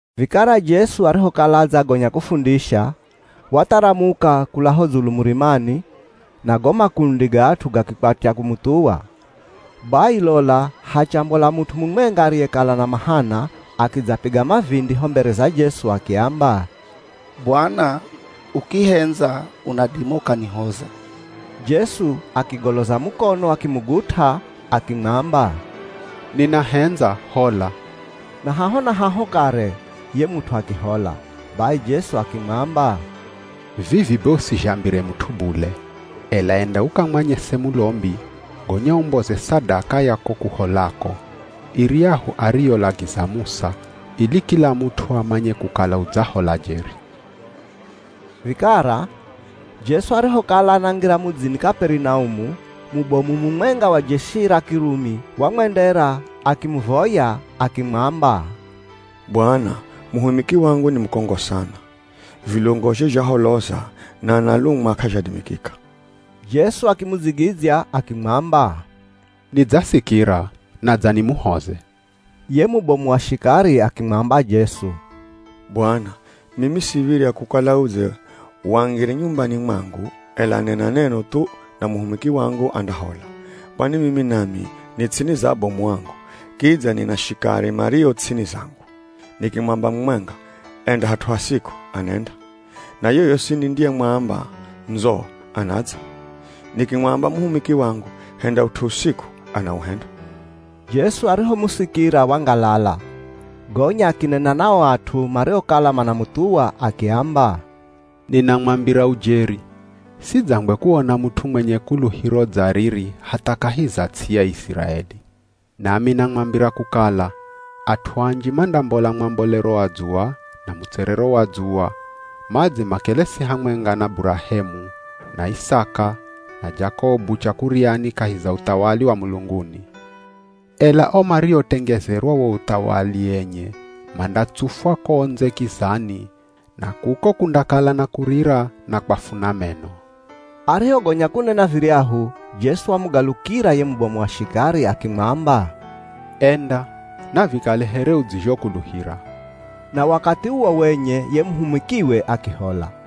Vikara Jesu arihokala adzagonya kufundisha, watharamuka kula ho dzulu murimani, na go makundi ga at'u gakikwatya kumuthuwa. Bai lola hachambola mut'u mumwenga ariyekala ana mahana, akidzapiga mavindi ho mbere za Jesu akiamba, “Bwana, ukihendza unadima ukanihoza!” Jesu akigoloza mukono akimugut'a akimwamba, “Ninahendza, hola.” Na haho na haho kare, ye mut'u akihola. Bai Jesu akimwamba, “Vivi be usizhambire mut'u bule, ela enda ukamwanyese mulombi, gonya umboze sadaka ya ko kuholako, iryahu ariyolagiza Musa, ili kila mut'u amanye kukala udzahola jeri.” Vikara, Jesu arihokala anangira mudzini Kaperinaumu, mubomu mumwenga wa jeshi ra Kirumi wamwendera, akimuvoya akimwamba, “Bwana, muhumiki wangu ni mukongo sana. Vilungozhe zhaholoza na analumwa k'azhadimikika.” Jesu akimudzigidzya akimwamba, “Nidzasikira, nadza nimuhoze.” Ye mubomu wa shikari akimwamba Jesu, “Bwana, mimi siv̱irya kukala udze wangire nyumbani mwangu, ela nena neno thu, na muhumiki wangu andahola. Kwani mimi nami ni ts'ini za abomu angu, kidza nina shikari mario ts'ini zangu. Nikimwamba mumwenga, ‘Enda hat'u hasiku,’ anenda. Na yoyosi nindiyemwamba ‘Ndzo,’ anadza. Nikimwamba muhumiki wangu ‘Henda ut'u usiku’ anauhenda.” Jesu arihomusikira wangalala, gonya akinena na o at'u mariokala manamuthuwa akiamba, “Ninamwambira ujeri, sidzangwe kuona mut'u mwenye kuluhiro dza riri hatha kahi za ts'i ya Iziraeli. Nami namwambira kukala, at'u anji mandambola mwambolero wa dzuwa, na mutserero wa dzuwa, madze makelesi hamwenga na Burahemu, na Isaka, na Jakobu chakuryani kahi za uthawali wa mulunguni. Ela o mariotengezerwa wo uthawali enye, mandatsufwa ko ndze kizani, na kuko kundakala na kurira na kwafuna meno.” Arihogonya kunena viryahu, Jesu wamugalukira ye mubomu wa shikari akimwamba, “Enda, navikale here udzizhokuluhira.” Na wakathi uwo wenye ye muhumikiwe akihola.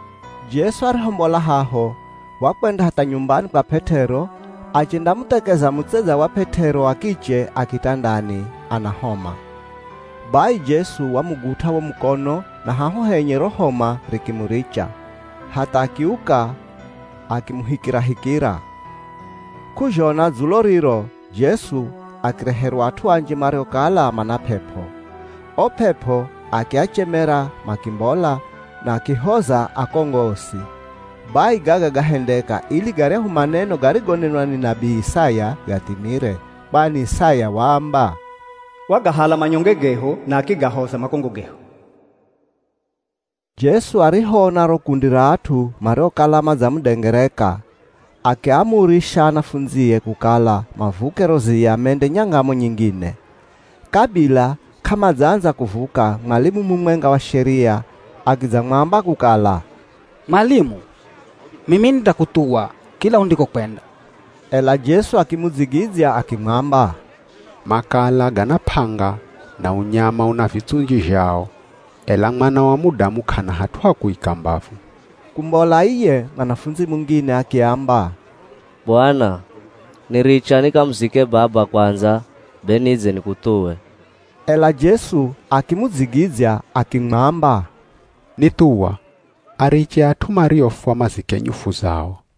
Jesu arihombola haho, wakwenda hatha nyumbani kwa P'et'ero, achendamuthekeza mutsedza wa P'et'ero wa kiche a kitandani, ana homa. Bai, Jesu wamugut'a wo mukono, na haho henye ro homa rikimuricha, hatha akiuka akimuhikirahikira. K'uzhona dzulo riro, Jesu akireherwa at'u anji mariokala mana p'ep'o. O p'ep'o akiachemera makimbola, na akihoza akongo osi. Bai gaga gahendeka, ili garyahu maneno garigonenwa ni nabii Isaya gathimire. Kwani Isaya waamba, “Wagahala manyonge gehu, na akigahoza makongo gehu.” Jesu arihoona ro kundi ra at'u mariokala madzamudengereka, akiaamurisha anafundzie kukala mavuke ro ziya mende nyangamo nyingine. Kabila k'amadzaandza kuvuka, mwalimu mumwenga wa Sheria akidzamwamba kukala, “Mwalimu, mimi nindakuthuwa kila undikokwenda.” Ela Jesu akimudzigidzya akimwamba, “Makala gana p'anga, na unyama una vitsunji zhao, ela Mwana wa Mudamu k'ana hat'u ha kuika mbavu.” Kumbola iye, mwanafundzi mungine akiamba, “Bwana, niricha nikamuzike baba kwandza be nidze nikuthuwe.” Ela Jesu akimudzigidzya akimwamba, “Nithuwa. Ariche at'u mariofwa mazike nyufu zao.”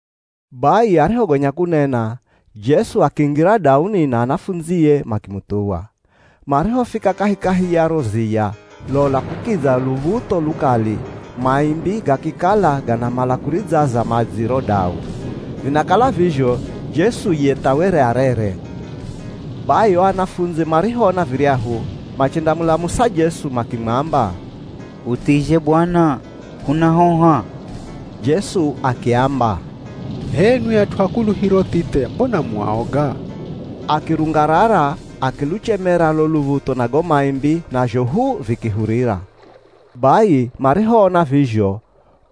Bai arihogonya kunena, Jesu akingira dauni na anafundzie makimuthuwa. Marihofika kahikahi ya ro ziya, lola kukidza luv̱utho lukali, maimbi gakikala ganamala kuridzaza madzi ro dau. Vinakala vizho, Jesu ye tha were arere. Bai o anafundzi marihoona viryahu machendamulamusa Jesu makimwamba, “Huthizhe Bwana, hunahoha!” Jesu akiamba, “H'enwi at'u a kuluhiro thithe mbona mu aoga.” Akirungarara akiluchemera lo luv̱utho na go maimbi, nazho hu vikihurira. Bai marihoona vizho,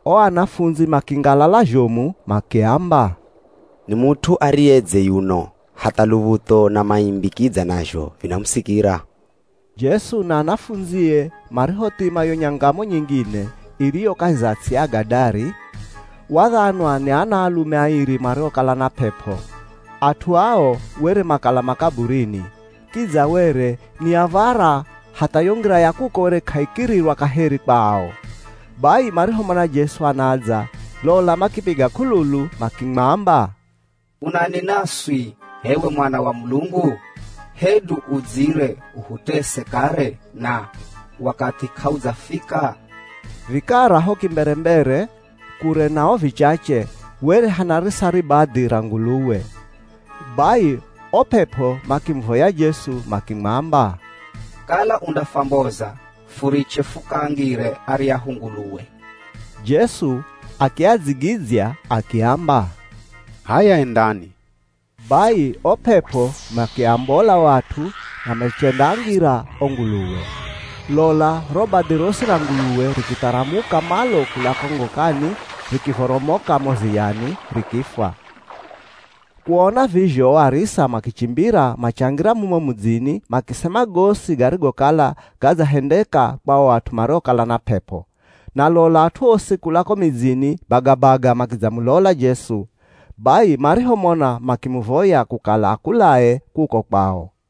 o anafundzi makingalala zhomu makiamba, “Ni mut'u ariyedze yuno! Hatha luv̱utho na maimbi kidza nazho vinamusikira!” Jesu na anafundzie marihothima yo nyangamo nyingine, iriyo kahi za ts'i ya Agadari, wadhanwa ni anaalume airi mariokala na p'ep'o. At'u ao were makala makaburini, kidza were ni av̱ara hatha yo ngira ya kuko were k'aikirirwa kaheri kwa ao. Bai marihomona Jesu anadza, lola makipiga k'ululu makimwamba, “Unani naswi h'ewe Mwana wa Mulungu? Hedu udzire uhutese kare, na wakathi k'audzafika?” Vikara ho kimberembere, kure nao vichache, were hanarisa ribadhi ra nguluwe. Bai, o p'ep'o makimuvoya Jesu makimwamba, “Kala undafwamboza, furiche fukaangire aryahu nguluwe.” Jesu akiadzigidzya, akiamba, “H'aya, endani.” Bai o p'ep'o makiambola o at'u na machendaangira o nguluwe. Lola ro badhi rosi ra nguluwe rikitharamuka malo kula ko ngokani, rikivoromoka mo ziyani, rikifwa. Kuona vizho, o arisa makichimbira, machangira mumo mudzini, makisema gosi garigokala gadzahendeka kwa o at'u mariokala na p'ep'o. Na lola at'u osi kula ko midzini bagabaga makidzamulola Jesu. Bai marihomona makimuvoya kukala akulae kuko kwao.